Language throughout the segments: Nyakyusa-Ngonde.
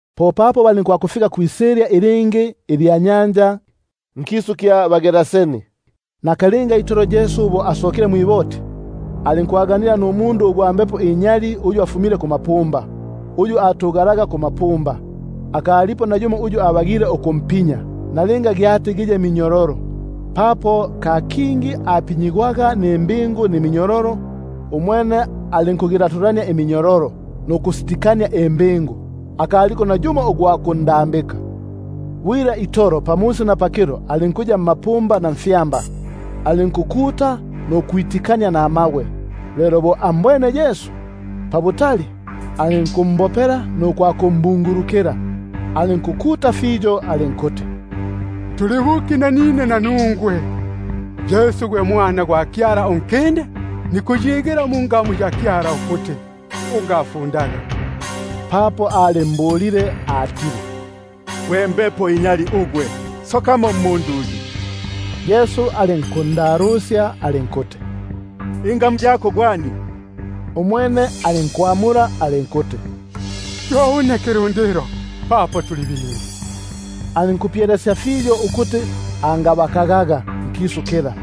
Popapo balinkwakufika kwisilya ilingi ilya nyanja, nkisu kya baGeraseni. Lelo bo asokile mwiboti, alinkwaganila numundu ugwa mbepo inyali uyu afumile mmapumba, muno ayaga bwila. Akalipo nayumo uyu abagile ukumpinya, nalinga giye minyololo, papo ka kingi apinyigwaga nimbingu niminyololo, umwene alinkugilatulania iminyololo nukusiti- kania imbingu, akaliko nayumo ugwa kundambika. Bwila itolo pamusi na pakilo alinkuya mmapumba na mfyamba, alinkukuta nukwitikania namabwe. Lelo bo ambwene Yesu pabutali, alinkumbopela nukwakumbungulukila, alinkukuta fiyo alinkuti: Tuli buki nanine nanungwe, Yesu gwe Mwana gwa Kyala Unkinde? Nikukuyigila mwa Kyala ukuti, ungafundaga. Papo alimbulile atile: Gwe mbepo inyali ugwe, sokamo mmundu uyu. Yesu alinkundalusya alinkuti: Gwani ingamu? Umwene alinkwamula alinkuti: Yo une Kilundilo, papo tuli bingi. Alinkumpyelesya fiyo ukuti angabakagaga nkisu kila.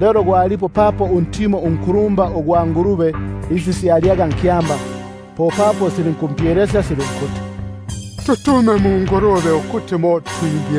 Lelo gwalipo papo untimo unku- lumba ugwa ngulube isi syalyaga nkyamba; popapo silinkumpyelesya silinkuti: Ututume mungulube ukuti mo twingi-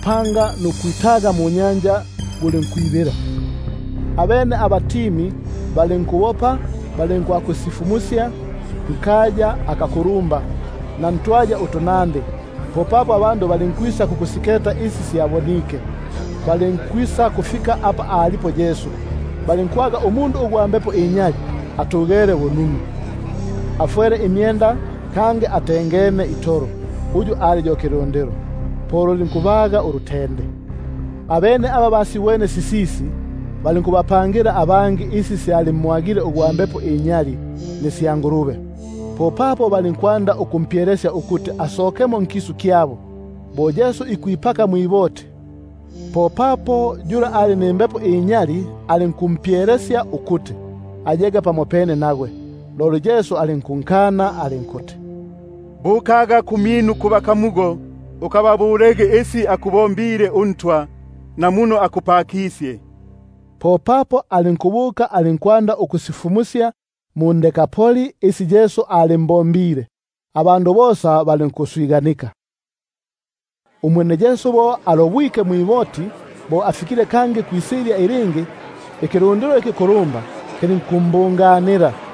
panga nukwitaga munyanja, gulinkwibila. Abene aba batimaga balinkubopa, balinkwakusifumusya nkaya akakulumba na ntwaya utunandi. Popapo abandu balinkwisa kukusiketa isi syabonike. Balinkufika apa alipo Yesu, balinkumbona ugwa mbepo inyali uyu ali yo kilundilo atugesye, afwele imyenda, kangi atengene itolo; po lulinkubaga ulutende. Abene aba basibwene sisisi, balinkubapangila isi syalimwagile ugwa mbepo inyali nisya ngulube. Popapo balinkwanda ukumpyelesya ukuti asokemo nkisu kyabo. Umwene bo ikwipaka mwiboti, popapo yula ali nimbepo inyali alinku- mpyelesya ukuti ayege pamopene nagwe. Loli alinkunkana alinkuti: Bukaga kumyinu kubakamugo, ukababulege isi akubombile uNtwa, na muno akupakikisye. Popapo alinkubuka alinkwanda ukusifumusya mu-Dekapoli isi Yesu alimbombile; abandu bosa balinkuswiganika. Umwene Yesu bo alobwike mwiboti bo afikile kangi kwisilya ilingi, ikilundilo ikikulumba kilinkubungana kumyake;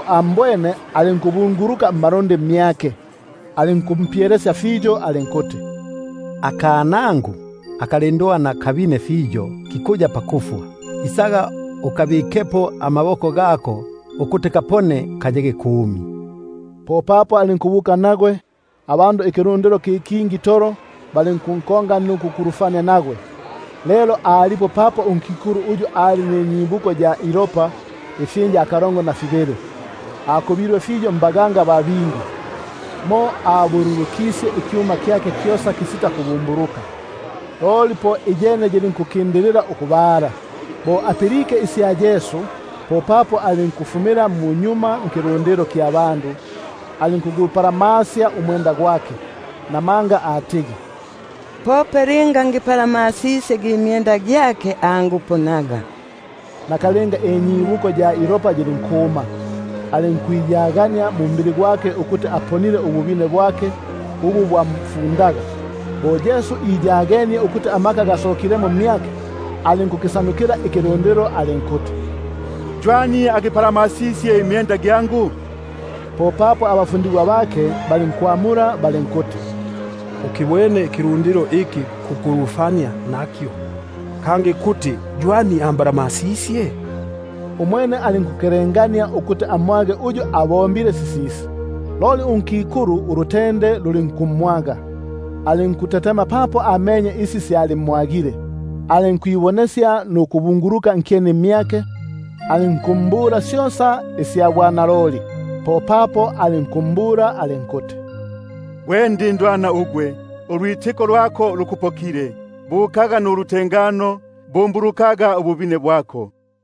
ambwene alinkubunguluka mmalundi mmyake. Alinkumpyelesya fiyo alinkuti: Akanangu akalindwana kali pakusililika, isaga ukakabikepo amaboko gako ukuti kapone, kayege kumi. Popapo alinkubuka nagwe; abandu ikilundilo ki kingi itolo balinkunkonga nukukulufania nagwe. Lelo alipo unkikulu uyu ali ninyibuko ya ilopa ifyinja kalongo na fibili, akubilwe fiyo mbaganga ba bingi, mo abululukisye ikyuma kyake kyosa kisita kubumbuluka, loli iyene yilinkukindilila ukubala. Bo apilike isya Yesu, popapo alinkufumila munyuma mbandu, alinkugupalamasya umwenda gwake. Namanga atigi: Pope linga ngipalamasisye na gi myenda gyake nisakupona. Nakalinga inyibuko ya ilopa yilinkuma, alinkwiyagania mumbili gwake ukuti aponile kulufundo lula. Nakalmga Yesu bo iyagenie ukuti amaka gasokilemo mmyake, alinkukisyutukila ikilundilo alinkuti: Ywani agipalamasisye imyenda gyangu? Popapo abafundigwa bake balinkwamula balinkuti: Ukibwene ikilundilo iki kukulufania nakyo, kangi kuti ywani ambalamasisye? Umwene alinkukelengania ukuti amwage uyu abombile sisisi. Loli unkikulu ulutende lulinkumwaga, alinkutetema papo amenye isi syalimwagile, alinkwisa nukubunguluka nkyeni mmyake, alinkumbula syosa isya mbwanaloli. Popapo alinkumbula alinkuti: Gwe mwanangu, ulwitiko lwako lukupokile; bukaga nulutengano, bumbulukaga kulufundo lwako.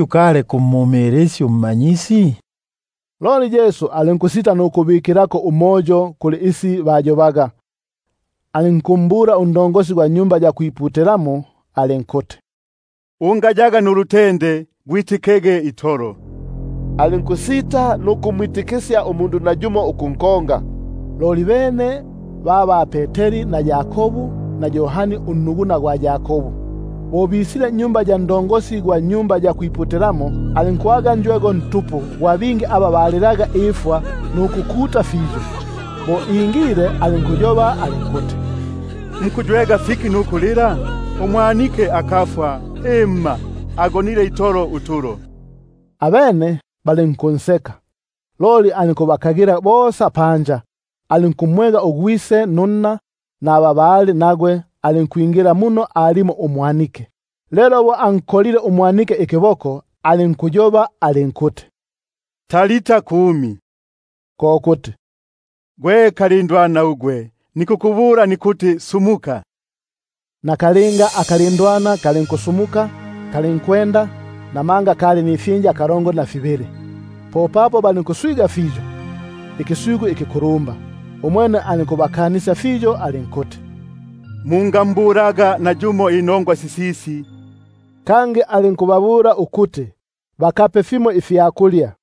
ukali kumumilisya uMmanyisi? Loli Yesu alinkusita nukubikilako umoyo ilisyu ili bayobaga, alinkumbula unkulumba gwa Sinagogi alinkuti: Ungayaga nulutende, gwitikege itolo. Alinkusita nukumwitikisya nayumo umundu ukunkonga, loli bene ba ba-Peteri na Yakobu, na Yohani ugwamyabo gwa Yakobu. Popapo alinkwakwingila nnyumba ya nkulumba gwa Sinagogi, alinkwaga njwego ntupu gwa bingi aba balilaga ifwa nukukuta fiyo. Bo ingile alinkuti: Mukuywega fiki nukulila? Umwanike akafwa, himma, agonile itolo utulo. Abene balinkunseka. Umwene bo abakagile panja bosa, alinkumwega ugwise gwa mwanike, nunna, naba bali nagwe, alinkwingila muno alimo umwanike. Lelo bo ankolile umwanike ikiboko, alinkuyoba alinkuti: “Talita kumi”, ko kuti: Gwe kalindwana ugwe, nikukubula nikuti sumuka. Nakalinga akalindwana kalinkusumuka, kalinkwenda, namanga kali nifyinja kalongo na fibili. Popapo balinkutenguka ikitengusi ikikulumba. Umwene alinkubakanisya fiyo alinkuti: Mungambulaga nayumo inongwa sisisi: kangi alinkuti bakape ifyakulya.